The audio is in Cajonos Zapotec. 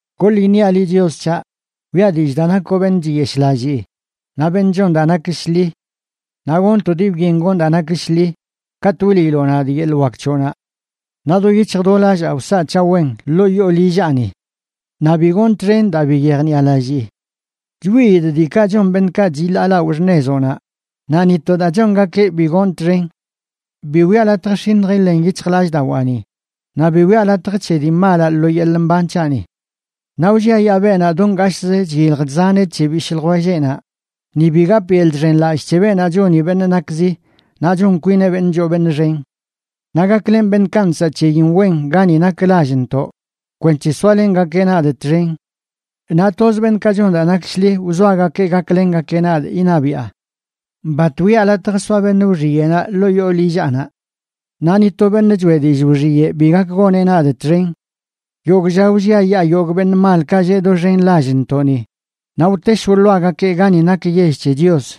Goḻ iṉiaꞌ liꞌ, Chios c̱haꞌ, wiꞌa dillꞌ daa nakoꞌ beṉꞌ chiyeshꞌlallii naꞌ beṉꞌ chon daa nak shḻi. Naꞌ gonꞌ to dii byen gonꞌ daa nak shḻi katꞌ wliiloꞌ nadꞌ yeḻꞌ wak c̱hoꞌnaꞌ. Naꞌ do yic̱hj do lallaa wsaꞌ c̱haꞌ wen ḻoo yoo lillaꞌni. Naꞌ bi gonꞌ txen daa bi yejniꞌalallii. Chwiidꞌ diikaꞌ chon beṉꞌkaꞌ chiḻaalaoꞌ xṉezoꞌnaꞌ, naꞌ ni to daa chongakeꞌ bi gonꞌ txen. Bi wiꞌa latj x̱iṉj iḻen yic̱hjlallꞌdawaani, naꞌ bi wiꞌa latj c̱he dii malaꞌ lo yeḻꞌ mban c̱haꞌni. Naꞌ wlliayaa beenaꞌ do ngashꞌzə chyilj chzaneꞌ c̱he bishꞌ ljwelleꞌnaꞌ, ni bi gapꞌ yeḻꞌ chxenlallꞌ c̱he beenaꞌ choni beṉꞌ nakzi naꞌ chon kwineꞌ beṉꞌ choo beṉꞌ xen. Naꞌ gaklenꞌ beṉꞌkaꞌ nsaꞌ c̱heyin wen gani nak lallntoꞌ, kwenc̱he soalengakeꞌ nadꞌ txen. Naꞌ toz beṉꞌkaꞌ chon daa nak shḻi wzoagakee gaklengakeꞌ nadꞌ iṉabiꞌa. Bat wiꞌa latj soa beṉꞌ wxiyeꞌnaꞌ ḻoo yoo lillaꞌnaꞌ. Naꞌ ni to beṉꞌ choeꞌ dillꞌ wxiyeꞌ bi gak goneꞌ nadꞌ txen. Yogꞌ lla wlliayaa yogꞌ beṉꞌ malkaꞌ lleꞌ doxen lallntoꞌni, naꞌ wtesh wḻoagakee gani nak yell c̱he Chios.